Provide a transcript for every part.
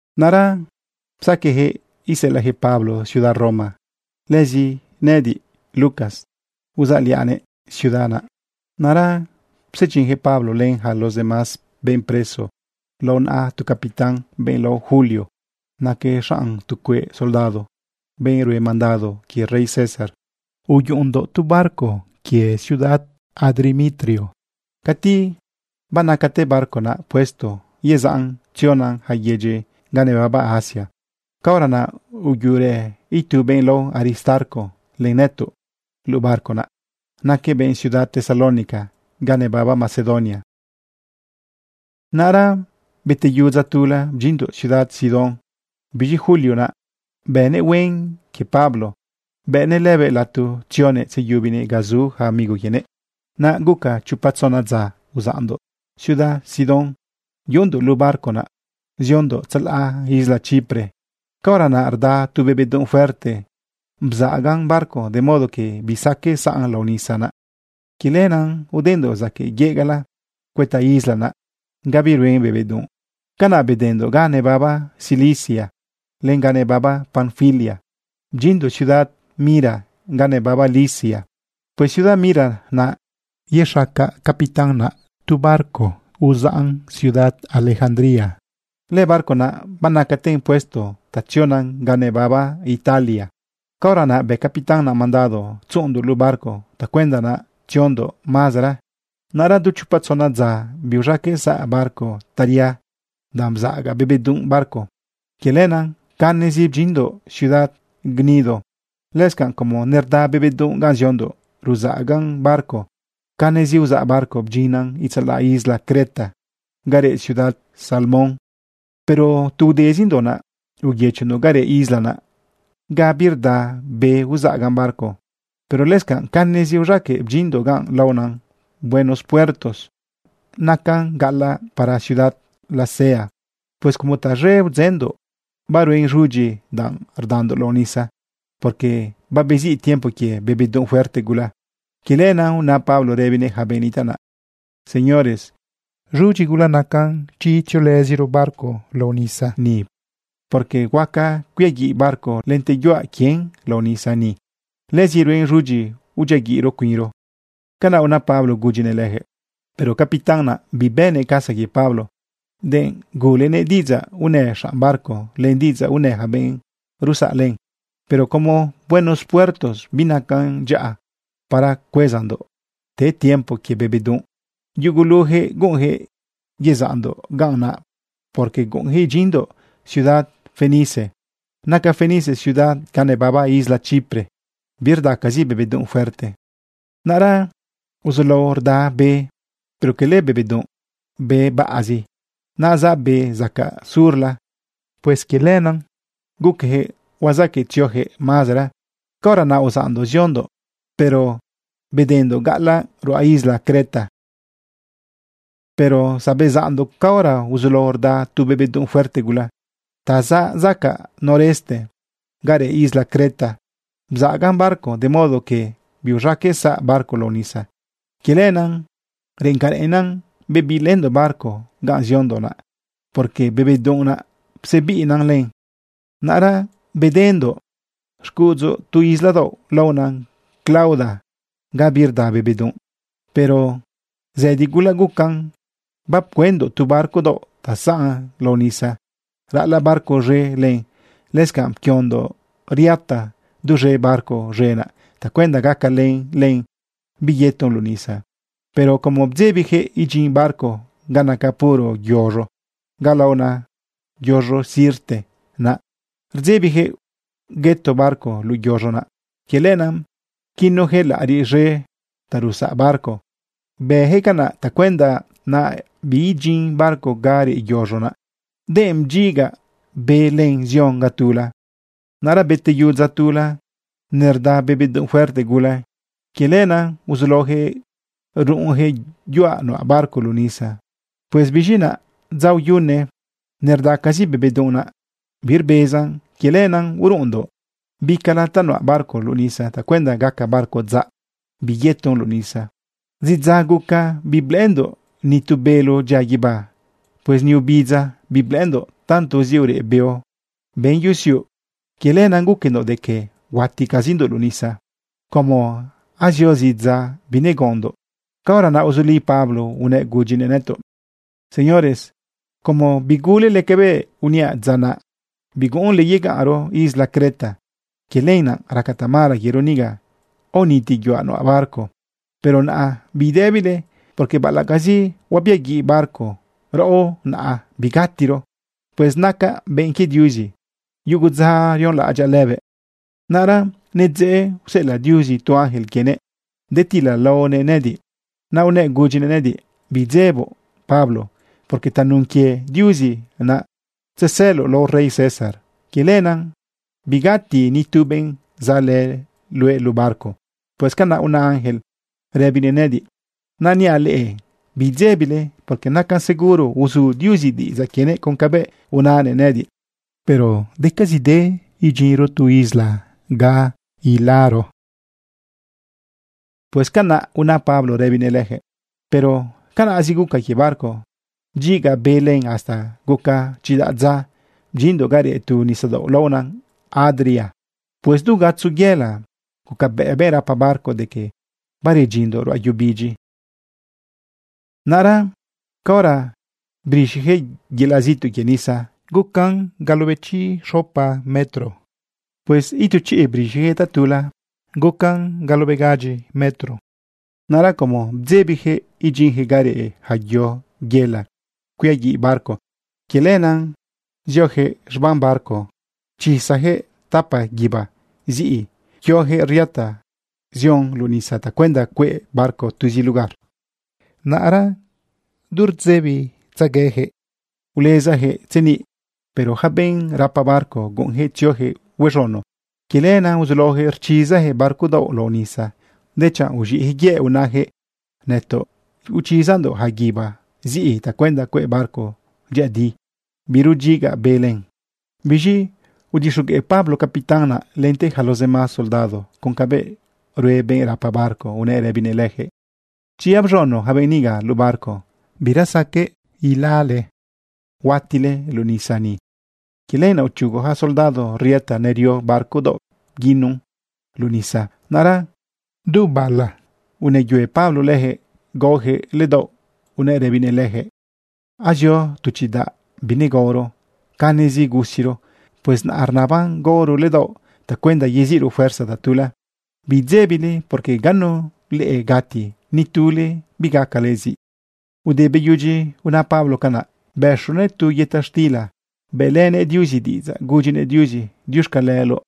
Naꞌra psaqueꞌyaquëꞌ iseꞌelaꞌyaquëꞌ Pablo ciudad Roma. Lëzi nëꞌëdiꞌ, Lucas, uzaꞌliaꞌnëꞌ ciudad naꞌ. Naꞌra psedyinjëꞌ Pablo len yaca los demás benꞌ preso lao naꞌa tu capitán, benꞌ lao Julio. Naquëꞌ xanꞌ tu cueꞌ soldado, benꞌ rue mandado quie rey César. Uyuꞌundoꞌ tu barco quie ciudad Adrimitio. Cati banacate barco naꞌ puesto yezaꞌn tziona yaca yedyi ga nebaba Asia, caora naꞌ uyuꞌurë itu benꞌ lao Aristarco len nëtoꞌ luꞌu barco naꞌ. Naquëꞌ benꞌ ciudad Tesalónica ga nebaba Macedonia. Naꞌra beteyu dza tula bdyinndoꞌ ciudad Sidón. Biz̃i Julio naꞌ bënëꞌ huen quie Pablo, bëꞌnëꞌ lëbëꞌ lato tzionëꞌ tzeyubinëꞌ ga zu yaca amigo quienëꞌ. Naꞌ guca chopa tzona dza uzaꞌndoꞌ ciudad Sidón yuꞌundoꞌ luꞌu barco naꞌ ziondoꞌ tzalaꞌ isla Chipre. Caora naꞌ rda tu be bedunꞌ fuerte bzaꞌagan barco de modo que bisaqueꞌ saꞌn lao nisa naꞌ. Quie lenaꞌ udendoꞌ zaquëꞌ yegaꞌla cuëta isla naꞌ ga biruen be bedunꞌ. Canaꞌ bedendoꞌ ga nebaba Cilicia len ga nebaba Panfilia bdyinndoꞌ ciudad Mira ga nebaba Licia. Pues ciudad Mira naꞌ yexaca capitán naꞌ tu barco uzaꞌn ciudad Alejandría. Lëbarco naꞌ banacaten puesto ta tziona ga nebaba Italia. Caora naꞌ bë capitán naꞌ mandado tzuꞌundoꞌ luꞌu barco tacuenda naꞌ tziozindoꞌ mazera. Naꞌra du chopa tzona dza biuz̃aqueꞌ saꞌ barco taria danꞌ bzaꞌaga be bedunꞌ barco. Quie lenaꞌ canezi bedyinndoꞌ ciudad Gnido. Lëscanꞌ como nerda be bedunꞌ ganꞌ ziondoꞌ ruzaꞌagan barco, canezi uzaꞌ barco bdyinndoꞌ itzalaꞌ isla Creta ga reꞌ ciudad Salmón. Pero tu udezindoꞌ naꞌ, uyëchondoꞌ ga reꞌ isla naꞌ, ga birda be uzaꞌagan barco. Pero lëscanꞌ canezi uz̃aqueꞌ bdyinndoꞌ ga laona Buenos Puertos. Naꞌ nacan gaꞌalaꞌ para ciudad Lasea. Pues como taz̃e udzëndoꞌ, baruen z̃udyi danꞌ rdandoꞌ lao nisa, porque babeziꞌ tiempo quie be bedunꞌ fuerte gula. Quie lenaꞌ una Pablo rëbinëꞌ yaca benꞌ nitaꞌ naꞌ: ―Señores, z̃udyi gula nacan chi tziolëziro barco lao nisa ni, porque huaca cuiaguiꞌ barco lente yuaꞌ quien lao nisa ni. Lëzi ruen z̃udyi udyiaguiꞌro cuinro. ―Canaꞌ una Pablo gudyinëꞌ lejëꞌ. Pero capitán naꞌ, bibënëꞌ casa quie Pablo denꞌ gulenëꞌ diꞌidzaꞌ unë xanꞌ barco len diꞌidzaꞌ unë yaca benꞌ rusaꞌ len. Pero como Buenos Puertos binacan dyaꞌa para cuezandoꞌ te tiempo quie be bedunꞌ, yugulujëꞌ guꞌunjëꞌ yezaꞌndoꞌ ganꞌ naꞌ, porque guꞌunjëꞌ idyinndoꞌ ciudad Fenice. Naca Fenice ciudad ga nebaba isla Chipre birdacazi be bedunꞌ fuerte. Naꞌra uzulao rda be, pero cala be bedunꞌ, be baꞌazi naꞌ zaꞌ be zacaꞌ surla. Pues quie lenaꞌ guqueyaquëꞌ huazaqueꞌ tzioyaquëꞌ mazera. Caora naꞌ uzaꞌndoꞌ ziondoꞌ, pero bedendoꞌ gaꞌalaꞌ ruꞌa isla Creta. Pero zabezaꞌndoꞌ caora uzulao rda tu be bedunꞌ fuerte gula ta zaꞌ zacaꞌ noreste ga reꞌ isla Creta. Bzaꞌagan barco de modo que biuz̃aqueꞌ saꞌ barco lao nisa. Quie lenaꞌ reꞌen ca reꞌennan, bebiꞌlëndoꞌ barco ganꞌ ziondoꞌ naꞌ, porque be bedunꞌ naꞌ psebiꞌina len. Naꞌra bedendoꞌ xcuꞌudzu tu isla daoꞌ laona Clauda ga birda be bedunꞌ. Pero zëdi gula gucan bapcuëndoꞌ tu barco daoꞌ ta zaꞌ lao nisa ralaꞌ barco z̃e len. Lëscanꞌ bapquiondoꞌ riata duz̃e barco z̃e naꞌ tacuenda gacalen len biyeton luꞌu nisa. Pero como rdzebiyaquëꞌ idyin barco ga naca puro yoz̃o, ga laona yoz̃o sirte, naꞌ rdzebiyaquëꞌ hueto barco luꞌu yoz̃o naꞌ, quie lenaꞌ pquinuyaquëꞌ laꞌariꞌ z̃e ta rusaꞌ barco. Bëjëꞌ canaꞌ tacuenda naꞌ biidyin barco ga reꞌ yoz̃o naꞌ, denꞌ bdyiga be len zion ga tula. Naꞌra beteyu dza tula nerda be bedunꞌ fuerte gula. Quie lenaꞌ uzulaoyaquëꞌ ruꞌunyaquëꞌ yuaꞌ nuꞌa barco luꞌu nisa. Pues biz̃i naꞌ, dza uyune nerdacazi be bedunꞌ naꞌ, birbezan. Quie lenaꞌ uruꞌundoꞌ bicala ta nuꞌa barco luꞌu nisa tacuenda gaca barco dzaꞌ biyeton luꞌu nisa. Zidza guca biblëꞌëndoꞌ ni tu bélo dyian guibá. Pues ni obidza biblëꞌëndoꞌ tantozi ureꞌ beo ben yusiuꞌ. Quie lenaꞌ guquendoꞌ de que huaticazindoꞌ luꞌu nisa. Como azio zidza binegaondoꞌ, caora naꞌ uzuli Pablo unëꞌ gudyinëꞌ nëtoꞌ: ―Señores, como bigulele cabëꞌ uniaꞌ dza naꞌ, biguꞌunle yegaꞌnro isla Creta, quie lenaꞌ raca tamala quiero niga aoniti yuaꞌ nuꞌa barco. Pero naꞌa bidëbile, porque baꞌalaꞌcazi huabiaguiꞌ barco, raꞌo naꞌ bigatiro. Pues nacaꞌ benꞌ quie Diuzi. Yugu dza rionlaꞌadyaꞌ lëbëꞌ. Naꞌra nidzeꞌ useꞌelaꞌ Diuzi tu ángel quienëꞌ detilalaonëꞌ nëꞌëdiꞌ. Naꞌ unëꞌ gudyinëꞌ nëꞌëdiꞌ: “Bidzeboꞌ, Pablo, porque tanun quie Diuzi naꞌ tzesëloꞌ lao rey César. Quie lenaꞌ bigati ni tu benꞌ zaꞌlë luëꞌ luꞌu barco.” Pues canaꞌ una ángel rëbinëꞌ nëꞌëdiꞌ. Naꞌ niaꞌ leꞌe bidzebile, porque nacan seguro uzu Diuzi diꞌidzaꞌ quienëꞌ con cabëꞌ unanëꞌ nëꞌëdiꞌ. Pero decazide idyinro tu isla ga ilaro. ―Pues canaꞌ una Pablo rëbinëꞌ lejëꞌ. Pero canaꞌzi guca quie barco. Bdyiga be len hasta guca chidaꞌ dza bdyinndoꞌ ga reꞌ tu nisadaoꞌ laona Adria. Pues du gatzo yëla gucabëꞌ benꞌ rapa barco de que baredyinndoꞌ ruꞌa yu bidyi. Naꞌra caora brixiyaquëꞌ yelaꞌ zituꞌ quie nisa, gucan treinta y seis metro. Pues itu chiꞌ brixiyaquëꞌ tatula, gucan veintisiete metro. Naꞌra como bdzebiyaquëꞌ idyinjëꞌ ga reꞌ yaca yo yela cuiaguiꞌ barco, quie lenaꞌ ziojëꞌ z̃bam barco pchizayaquëꞌ tapa guíba ziꞌi pquiojëꞌ riata zion luꞌu nisa tacuenda cueꞌ barco tuzi lugar. Naꞌra du rdëbitzeguejëꞌ ulezajëꞌ tzeniꞌ. Pero yaca benꞌ rapa barco guꞌunyaquëꞌ tzioyaquëꞌ huez̃uno. Quie lenaꞌ uzulaoyaquëꞌ rchizayaquëꞌ barco daoꞌ lao nisa, dechanꞌ uz̃iꞌjëꞌ yëꞌ unajëꞌ: ―Nëtoꞌ ichizandoꞌ yaca guíba ziꞌi tacuenda cueꞌ barco dyëꞌëdi birudyiga be len. Biz̃i udixogueꞌ Pablo capitán naꞌ lente yaca los demás soldados con cabëꞌ rue benꞌ rapa barco unëꞌ rëbinëꞌ lejëꞌ: ―Chi abz̃uno yaca benꞌ niga luꞌu barco, bira saqueꞌ ilale. Huatile luꞌu nisa ni. Quie lenaꞌ uchugu yaca soldado riata ta nerio barco daoꞌ bguinun luꞌu nisa. Naꞌra du bala unëyue Pablo lejëꞌ gaojëꞌ ledaoꞌ unëꞌ rëbinëꞌ leyaquëꞌ: ―Azio tu chidaꞌ binegaoro, canezi gusiro. Pues naꞌ rnaban gaoro ledaoꞌ tacuenda yeziꞌro fuerza tatula. Bidzebile, porque ganu leꞌe gati, ni tule bigacale ziꞌ. Ude beyudyi una Pablo canaꞌ, bëxonëꞌ tu yëta xtila bëꞌlënëꞌ Diuzi diꞌidzaꞌ gudyinëꞌ Diuzi diuxcaleloꞌ.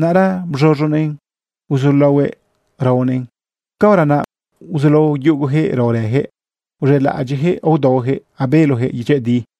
Naꞌra bz̃uz̃unëꞌn uzulaohuëꞌ raonëꞌn. Caora naꞌ uzulao yugojëꞌ raorëyaquëꞌ uz̃elaꞌadyiꞌjëꞌ aodaoyaquëꞌ abelojëꞌ dyëꞌëdi.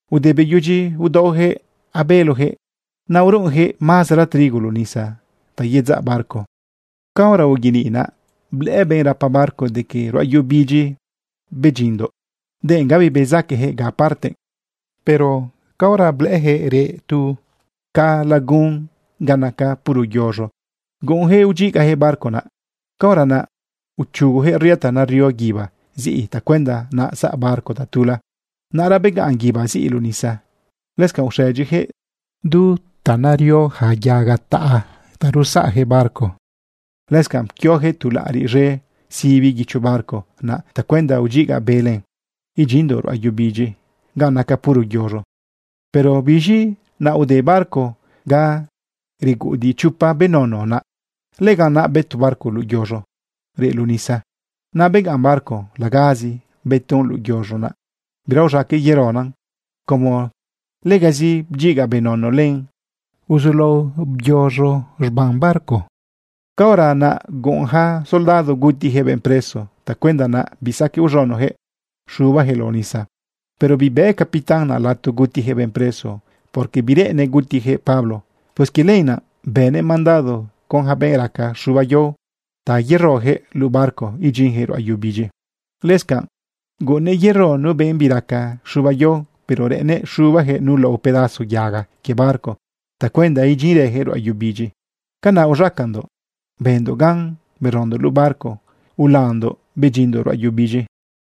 Ude beyudyi udaojëꞌ abelojëꞌ, naꞌ uruꞌunjëꞌ mazera trigo luꞌu nisa ta yedzaꞌ barco. Caora uyeniꞌ naꞌ, blëꞌë benꞌ rapa barco de que ruꞌa yu bidyi bedyinndoꞌ, denꞌ gabi bezaquejëꞌ ga parte. Pero caora blëꞌëyaquëꞌ reꞌ tu ca lagun ga naca puro yoz̃o, guꞌunjëꞌ udyigajëꞌ barco naꞌ. Caora naꞌ uchugoyaquëꞌ riata nario guíba ziꞌi tacuenda naꞌ saꞌ barco tatula. Naꞌra begaꞌn guíba ziꞌi luꞌu nisa. Lëscanꞌ uxëdyijëꞌ du nario yaca yaga taꞌa ta rusaꞌyaquëꞌ barco. Lëscanꞌ pquioyaquëꞌ tu laꞌariꞌ z̃e sibi guicho barco naꞌ tacuenda udyiga be len idyinndoꞌ ruꞌa yu bidyi ga naca puro yoz̃o. Pero biz̃i naꞌ ude barco ga reguꞌudiꞌ chopa benono naꞌ. Lëganꞌ naꞌ bëto barco luꞌu yoz̃o reꞌ luꞌu nisa. Naꞌ begaꞌn barco lagazi bëton luꞌu yoz̃o naꞌ. Bira uz̃aqueꞌ yerona. Como legazi bdyiga benono len, uzulao byoz̃o z̃bam barco. Caora naꞌ guꞌun yaca soldado gutijëꞌ benꞌ preso tacuenda naꞌ bisaqueꞌ uz̃unoyaquëꞌ xubayaquëꞌ lao nisa. Pero bibëꞌ capitán naꞌ lato gutijëꞌ benꞌ preso, porque bireꞌennëꞌ gutijëꞌ Pablo. Pues quie lenaꞌ bënëꞌ mandado con yaca benꞌ raca rz̃uba yao ta yerojëꞌ luꞌu barco idyinjëꞌ ruꞌa yu bidyi. Lëscanꞌ guꞌunnëꞌ yero nu benꞌ biraca z̃uba yao, pero reꞌennëꞌ xubajëꞌ nu lao pedazo yaga quie barco tacuenda idyinrëjëꞌ ruꞌa yu bidyi. Canaꞌ uz̃acandoꞌ bëndoꞌ gan berondoꞌ luꞌu barco ulandoꞌ bedyinndoꞌ ruꞌa yu bidyi.